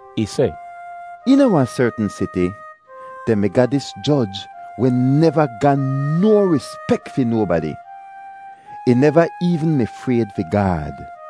Ih seh, “Eena wahn sertn siti dehn mi ga dis joj weh neva ga no rispek fi nobadi—ih neva eevn mi frayd fi Gaad.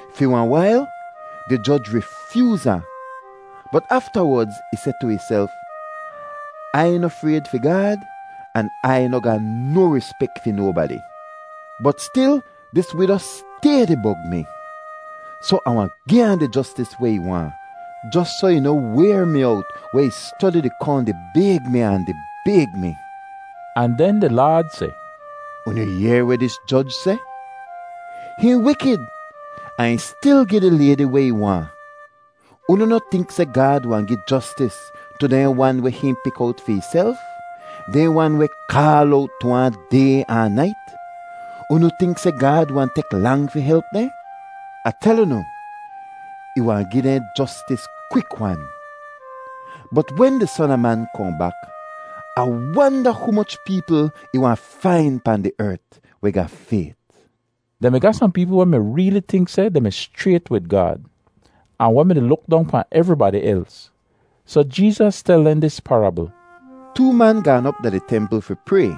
“Fi wahn wail di joj rifyooz ahn; bot aftawodz ih seh tu ihself, ‘Ai noh frayd fi Gaad an Ai noh ga no rispek fi nobadi, bot stil dis wido stay di bog mi, soh Ah wahn gi ahn di jostis weh ih waahn jos soh ih noh wayr mi owt weh ih stodi di kohn di bayg mi ahn di bayg mi.’” Ahn den di Laad seh, “Unu yehr weh dis joj seh? Hihn wikid ahn ih stil gi di laydi weh ih waahn. Unu noh tink seh Gaad wahn gi jostis tu dehn wan weh hihn pik owt fi ihself, dehn wan weh kaal owt tu ahn day ahn nait? Unu tink seh Gaad wahn tek lang fi help dehn? Ah tel unu, ih wahn gi dehn jostis kwik-wan. Bot wen di Son a Man kohn bak, Ah wanda humoch peepl ih wahn fain pahn di ert weh ga fayt.” Dehn mi ga sohn peepl weh mi reeli tink seh dehn mi schrayt wid Gaad, ahn weh mi-di luk dong pahn evribadi els, soh Jeezas tel dehn dis parabl: “Too man gaan op da di templ fi pray.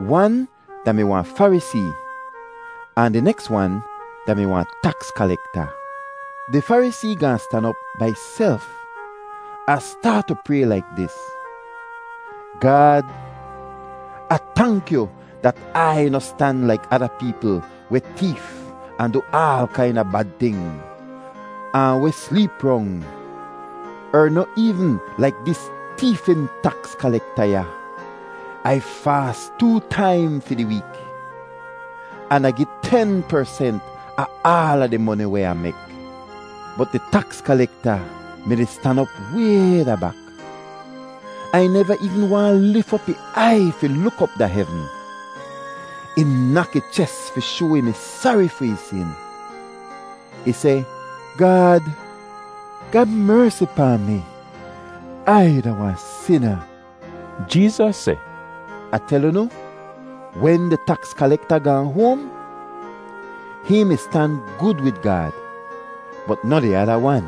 Wan da-mi wahn Farisee, ahn di neks wan da-mi wahn taks kalekta. Di Farisee gaahn stan op bai ihself ahn staat tu pray laik dis: ‘Gaad, Ah tank yu dat Ai noh stan laik ada peepl weh teef ahn du aal kaina bad ting, ahn weh sleep rong; er noh eevn laik dis teefin taks kalekta ya. Ai faas too taim fi di week, an Ah gi ten persent a aala di moni weh Ah mek.’ “Bot di taks kalekta mi-di stan op way da bak, ahn ih neva eevn waahn lif op ih aiy fi luk op da hevn. Ih nak ih ches fi shoa ih mi sari fi ih sin. Ih seh, ‘Gaad, ga mersi pahn mi. Ai da wahn sina.’” Jeezas seh, “Ah tel unu, wen di taks kalekta gaahn hoahn, hihn mi stan gud wid Gaad, bot noh di ada wan.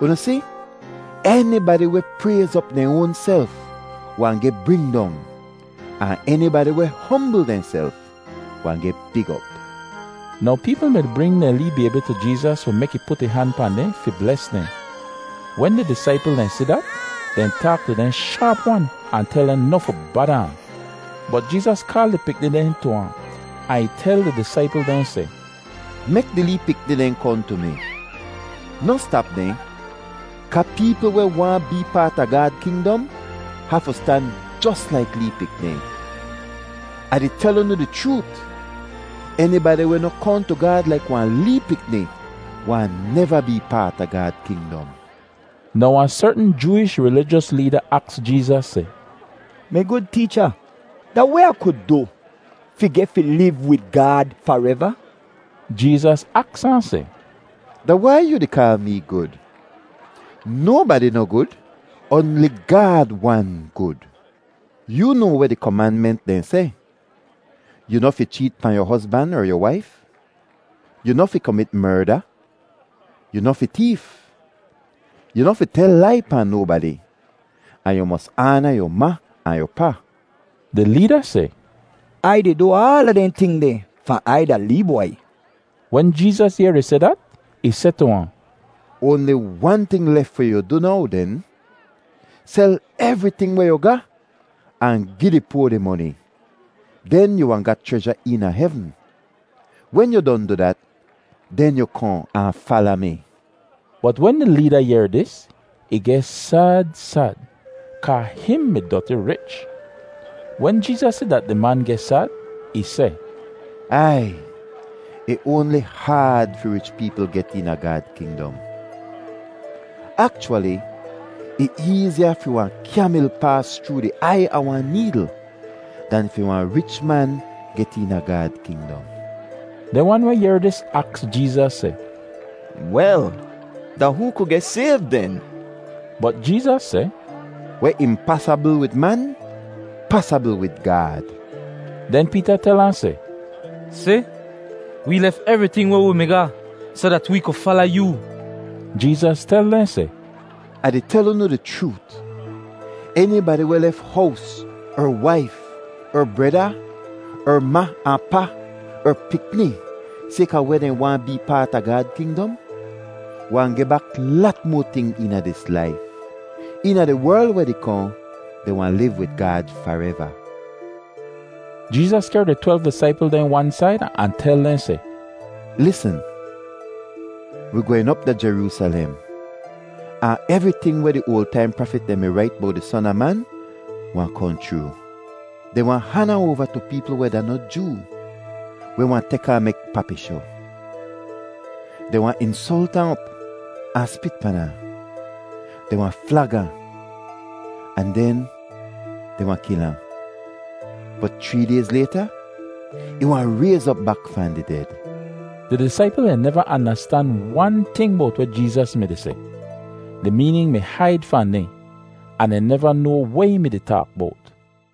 Unu si, enibadi weh prayz op dehn oanself wahn geh bring dong. Ahn enibadi weh hombl dehnself wahn geh big op.” Now peepl mi-di bring dehn lee baybi tu Jeezas fi mek ih put ih han pahn dehn fi bles dehn. Wen di disaipl dehn si dat, dehn taak tu dehn shaap-wan ahn tel dehn noh fi bada ahn. Bot Jeezas kaal di pikni dehn tu ahn, ahn ih tel di disaipl dehn seh, “Mek di lee pikni dehn kohn tu mi. Noh stap dehn, kaa peepl weh waahn bee paat a Gaad kingdom hafu stan jos laik lee pikni. Ah di tel unu di chroot, enibadi weh noh kohn tu Gaad laik wahn lee pikni wahn neva bee paat a Gaad kingdom.” Now wahn sertn Jooish rilijos leeda aks Jeezas seh, “Mi gud Teecha, da weh Ah ku du fi geh fi liv wid Gaad fareva?” Jeezas aks ahn seh, “Da wai yoo di kaal mee gud? Nobadi noh gud; oanli Gaad wan gud. “Yoo noa weh di komanment dehn seh: ‘Yu noh fi cheet pahn yu hozban er yu waif, yu noh fi komit merda, yu noh fi teef, yu noh fi tel lai pahn nobadi, ahn yu mos aana yu ma ahn yu pa.’” Di leeda seh, “Ai di du aala dehn ting deh fahn Ai da lee bwai.” Wen Jeezas yehr ih seh dat, ih seh tu ahn, “Oanli wan ting lef fi yu du now den. Sel evriting weh yu ga ahn gi di poa di moni, den yu wahn ga chreja eena hevn. Wen yu don du dat, den yu kohn ahn fala mi.” Bot wen di leeda yehr dis, ih geh sad sad kaa hihn mi doti rich. Wen Jeezas si dat di man geh sad, ih seh, “Ai! Ih oanli haad fi rich peepl get eena Gaad kingdom. Akchwali, ih eeziya fi wahn kyamil paas chroo di aiy a wahn needl dan fi wahn rich man get eena Gaad kingdom.” Dehn wan weh yehr dis aks Jeezas seh, “Wel, da hoo ku geh sayv den?” Bot Jeezas seh, “Weh impasabl wid man pasabl wid Gaad.” Den Peeta tel ahn seh, “Si, wee lef evriting weh wi mi ga soh dat wee ku fala yoo.” Jeezas tel dehn seh, “Ah di tel unu di chroot, enibadi weh lef hows er waif er breda er ma ahn pa er pikni sayka weh dehn waahn bee paat a Gaad kingdom, wahn geh bak lat moa ting eena dis laif. Eena di werl weh di kohn, dehn wahn liv wid Gaad fareva.” Jeezas kehr di twelv disaipl dehn wan said ahn tel dehn seh, “Lisn, wi gwehn op da Jeroosalem, ahn evriting weh di oal taim prafit dehn mi rait bowt di Son a Man wahn kohn chroo. Dehn wahn han ahn oava tu peepl weh da noh Joo weh wahn tek ahn mek papishoh. Dehn wahn insolt ahn op ahn spit pan ahn. Dehn wahn flag ahn, ahn den dehn wahn kil ahn, bot chree dayz layta ih wahn rayz op bak fahn di ded.” Di disaipl dehn neva andastan wan ting bowt weh Jeezas mi-di seh. Di meenin mi haid fahn dehn, ahn dehn neva noa weh ih mi-di taak bowt.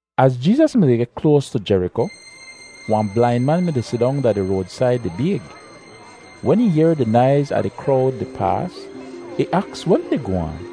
Az Jeezas mi-di geh kloas tu Jeriko, wahn blain man mi-di sidong da di roadsaid di bayg. Wen ih yehr di naiz a di krowd di paas, ih aks weh mi-di goh aan.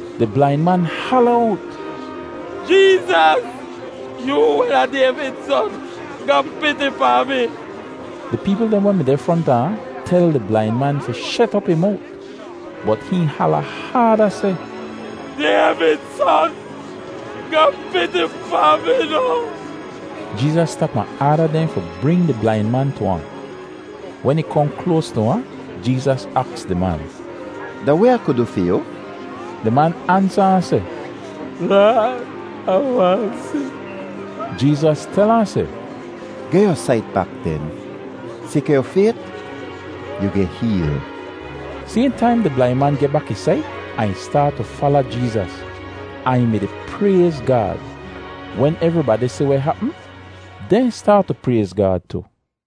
Di blain man hala owt, “Jeezas, yoo weh da Dayvid Son, ga piti pahn mi!” Di peepl dehn weh mi deh fronta ahn tel di blain man fi shet op ih mowt, bot hihn hala haada seh, “Dayvid Son, ga piti pahn mi noh!” Jeezas stap ahn aada dehn fi bring di blain man tu ahn. Wen ih kohn kloas tu ahn, Jeezas aks di man, “Da weh Ah ku du fi yu?” Di man ansa ahn seh, “Laad, Ah waahn si.” Jeezas tel ahn seh, “Geh yu sait bak den. Sayka yu fayt, yu geh heel.” Sayhn taim di blain man geh bak ih sait, ahn ih staat tu fala Jeezas, ahn ih mi-di prayz Gaad. Wen evribadi si weh hapm, dehn staat tu prayz Gaad tu.